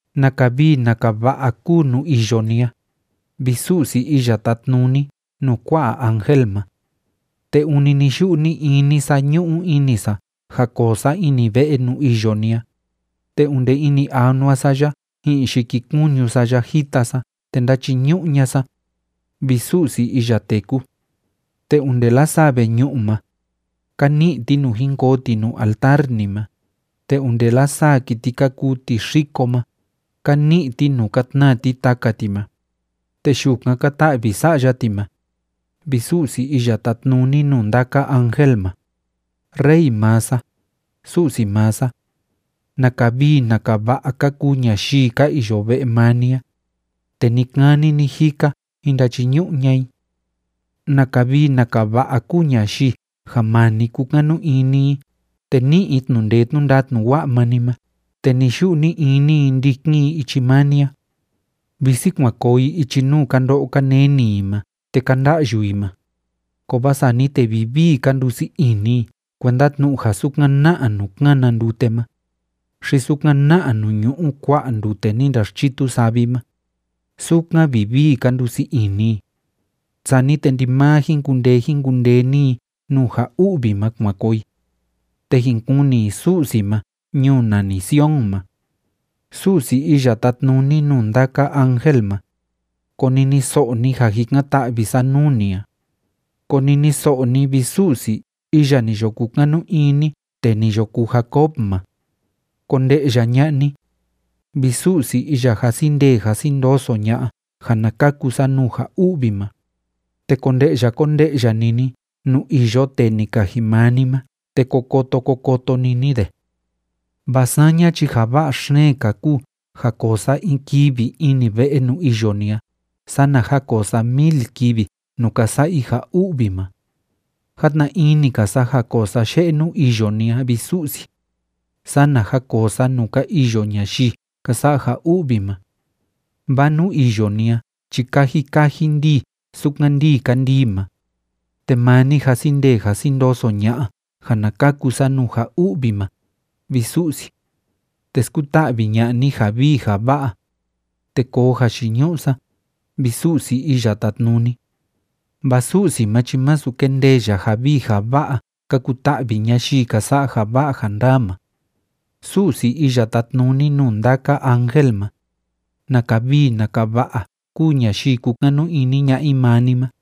¡Naka vii naka va'a kúu nuu iyo ni a, vi Su'si iya tátnuni nuu kua'a ángel ma! Te ûni ni‑yu'u ni‑ini sa ñu'u ini sa ja koo sa ini ve'e nuu iyo ni a, te onde ini anua sa ya ji'in yikikuñu sa ya jita sa te ndáchiñu'u ña'a sa, vi Su'si iya téku. Te onde lasaa veñu'u ma, ka ni'i ti nuu jin koo ti nuu altar ni ma, te onde lasaa kiti ka kuu tixiko ma, ka ni'i ti nuu ka tnaa ti taka ti ma, te yukan ka ta'vi sa'ya ti ma, vi Su'si iya tátnuni nuu ndaka ángel ma, Rey maa sa, Su'si maa sa. ¡Naka vii naka va'a ka kuu ñayii ka iyo ve'e maa ni a, te ni‑kani ni‑jika jin ndachiñu'u ña'a i! ¡Naka vii naka va'a kúu ñayii ja maa ni kúkanu ini i te ní'i i tnu'u ndee tnu'u ndatnu wa'a maa ni ma te ni‑yu'u ni‑ini i ndikin i ichi maa ni a! Visi kuan koo i ichi nuu ka ndo'o ka neni i ma te ka nda'yu i ma, kovaa sani te vivii ka ndusii ini i kuenda tnu'u ja sukan na'a nuu kána ndute ma, xi sukan na'a nuu ñu'u kua'a ndute ni ndaxchitu savi ma, sukan vivii ka ndusii ini i. Sani te ndimaa jin kundee jin kundee‑ni i nuu ja u'vi ma kuan koo i, te jin kuni i Su'si ma ñuu nani Sion ma. Su'si iya tátnuni nuu ndaka ángel ma, koniniso'o ni ja jikan‑ta'vi sa nuu ni a. Koniniso'o ni, vi Su'si iya ni yo kukanu ini tee ni yo kuu Jacob ma. Konde'ya ña'a ni, vi Su'si iya jasi ndee jasi ndoso ña'a ja na kaku sa nuu ja u'vi ma, te konde'ya konde'ya‑ni ni nuu iyo tee ni kaji maa ni ma te ko koto ko koto‑ni ni de. Vaa saña chi ja va'a xeen‑ka kúu ja koo sa in kivi ini ve'e nuu iyo ni a sana ja koo sa mil kivi nuu ka sa'a i ja u'vi ma. Játna ini‑ka sa ja koo sa ye'e nuu iyo ni a, vi Su'si, sana ja koo sa nuu ka iyo ñayii ka sa'a ja u'vi ma. Vaa nuu iyo ni a chi kaji kaji ndíi sukan ndíi kandii ma, te maa ni jasi ndee jasi ndoso ña'a ja na kaku sa nuu ja u'vi ma, vi Su'si. Te skuta'vi ña'a ni ja vii ja va'a, te koo jayiñu'u sa, vi Su'si Iya Tátnuni. Vaa Su'si ma chi masu kendee ya ja vii ja va'a ka kuta'vi ñayii ka sa'a ja va'a ja ndaa ma. Su'si iya tátnuni nuu ndaka ángel ma, ¡Naka vii naka va'a kúu ñayii kúkanu ini ña'a i maa ni ma!